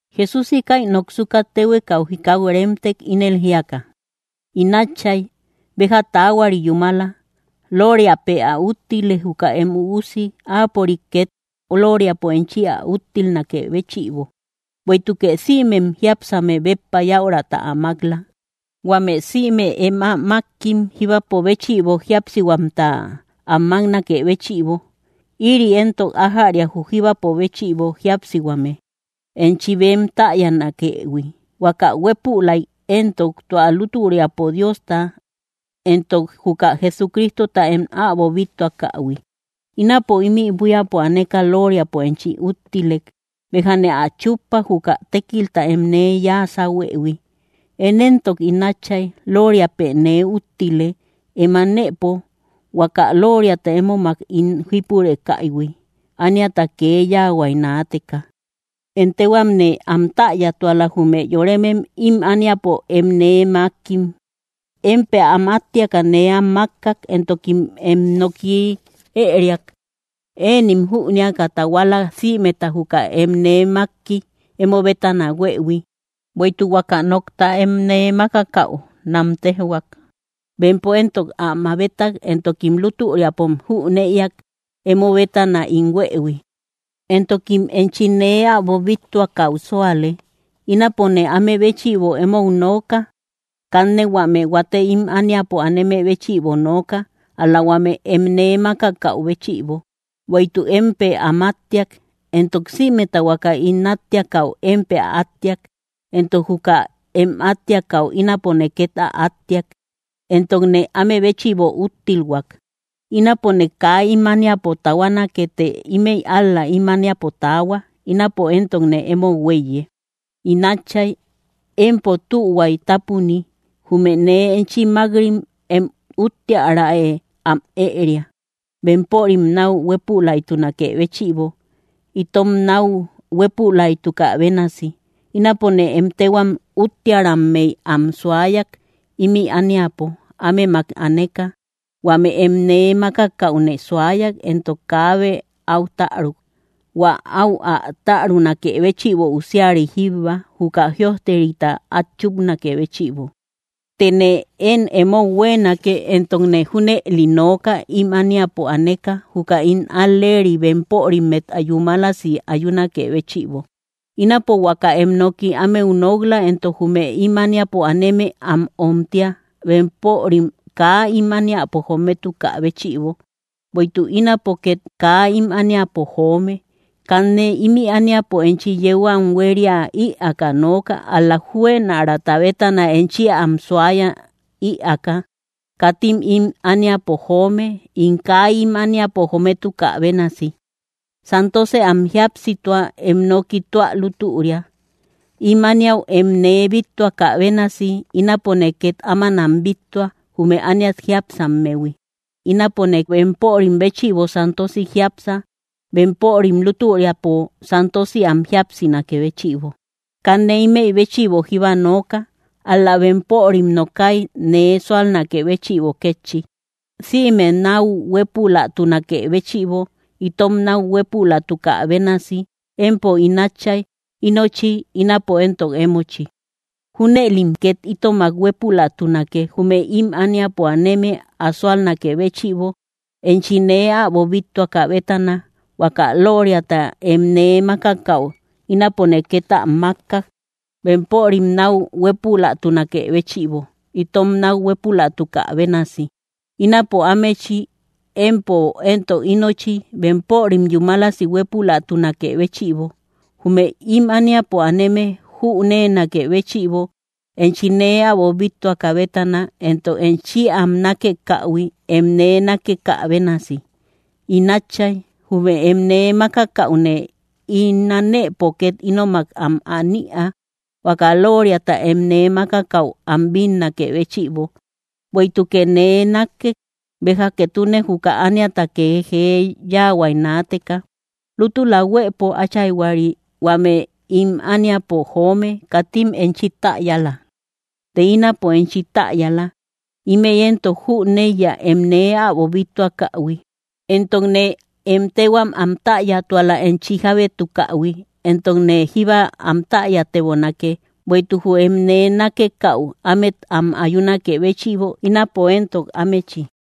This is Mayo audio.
Jesús íkäi noksuka, téhuekau jikau remtek, ínel jíaka: —In Átchay, béja taahuari yúmala. Loriapë ä úttile, juka em Üusi, áapörik két loriapo enchi ä úttilnakë béchïbo; bueïtukë sïmem jiápsame béppa yäurata ä mák‑la, huame sïme em ä mákkim jíbapo béchïbo jíapsihuamta am máknakë béchïbo. Ïri éntok ájäria, jü jíbapo béchïbo jíapsihuame: Enchi bem täyanakëhui, huaka huépülaik entok tua lútüriapo Diosta, éntok juka Jesucristota, em äbo bíttuakähui. ’Ínapo ímï buíapo aneka loriapo enchi úttilek. Béjane ä chúppak, juka tékilta em nee yáa sáhuëhui. Én éntok, ín Átchay, loriapë nee úttile em anëpo, huaka loriata émomak ín jípurekäihui, ániata kee yáahuay naateka. ’Em téhuamne am täyatuala, jume yoremem ím ániapo em nee mákkim. Émpë am átteaka nee am mákkak, éntokim em noki ëriak. Ënim jünéaka tahuala, sïmeta juka em nee mákki emo bétana huëhui; bueïtuk huaka nokta em nee mákakäu nam téjhuak. Bempo éntok ä mabetak, éntokim lútüriapom jünëiak emo bétana ín huëhui, éntokim enchi nee äbo bíttuakäu súale. ’Ínapone áme béchïbo emou nooka. Kanne huame huate ím ániapo aneme béchïbo nooka, ál‑la huame em nee mákakäu béchïbo; bueïtuk émpë am átteak, éntok sïmeta huaka ín átteakäu, émpë ä átteak, éntok juka em átteakäu, ínapone két ä átteak; éntokne áme béchïbo úttilhuak. ’Ínapone kaa ím ániapo tahuanake; të ímëi ál‑la ím ániapo taahua; ínapo éntokne emou huéiye. In Átchay, empo tühuay tápuni. Jume nee enchi mák‑rim, em úttearaë am ëeria, bempörim náu huépülaitunakë béchïbo, itom náu huépülaitukä bénasi. Ínapone em téhuam úttiarimmey am suayak, ímï ániapo ámemak aneka. Huame em nee mákakäune suayak, éntok kaabe áu täruk, hua áu ä tärunakë béchïbo usiari jíbba, juka jïojterita át chúpnakë béchïbo. ’Tëne én emou huéenake; éntokne junëli nooka, ím ániapo aneka, juka ín al‑leeri bempörimmet yúmalasi ayunakë béchïbo. Ínapo huaka em noki ámeu nok‑la; éntok jume ím ániapo aneme am omtia, bempörim kaa ím ániapo jometukä béchïbo, bueïtuk ínapo két kaa ím ániapo joome. Kanne ímï ániapo enchi yeu am huéria ïaaka nooka, ál‑la juënaraata bétana enchi am suaya ïaaka. Katim ím ániapo joome, ín kaa ím ániapo jometukä bénasi. Santosë am jíapsitua, em noki; tua lútüria. Ím ániau em nee bíttuakä bénasi, ínapone két áman am bíttua, jume ániat jiápsammehui. Ínapone bempörim béchïbo santosi jiápsa, bempörim lútüriapo santosi am jíapsinakë béchïbo. ’Kanne ímëi béchïbo jíba nooka, ál‑la bempörim nokay, nee súalnakeme béchïbo kétchi, sïmem náu huépülatunakë béchïbo, itom náu huépülatukä bénasi. Empo, ín Átchay, ínochi, ínapo éntok émochi; junëlim két itomak huépülatunake, jume ím ániapo aneme ä súalnakë béchïbo, enchi nee äbo bíttuakä bétana. Huaka loriata em nee mákakäu, ínapone két am mákkak, bempörim náu huépülatunakë béchïbo, itom náu huépülatukä bénasi. Ínapo ámechi, empo éntok ínochi, bempörim yúmalasi huépülatunakë béchïbo, jume ím ániapo aneme jüneenakë béchïbo, enchi nee äbo bíttuakä bétana, éntok enchi am nákekähui, em nee nákekä bénasi. ’In Átchay, jume em nee mákakäune ín anëpo két ínomak am an-ïa, huaka loriata em nee mákakäu am bínnakë béchïbo; bueïtukë nee nákkek, béja ketune juka ániata kee jee yáahuay naateka. Lútula huëpo Achayhuari, huame ím ániapo joome katim enchi täyala, të ínapo enchi täyala. Ímëi éntok jüneiya em nee äbo bíttuakähui. Éntokne em téhuam am täyatuala enchi jabétukähui, éntokne jíba am täyatebonake, bueïtuk jü em nee nákekau ámet am ayunakë béchïbo, ínapo éntok ámechi.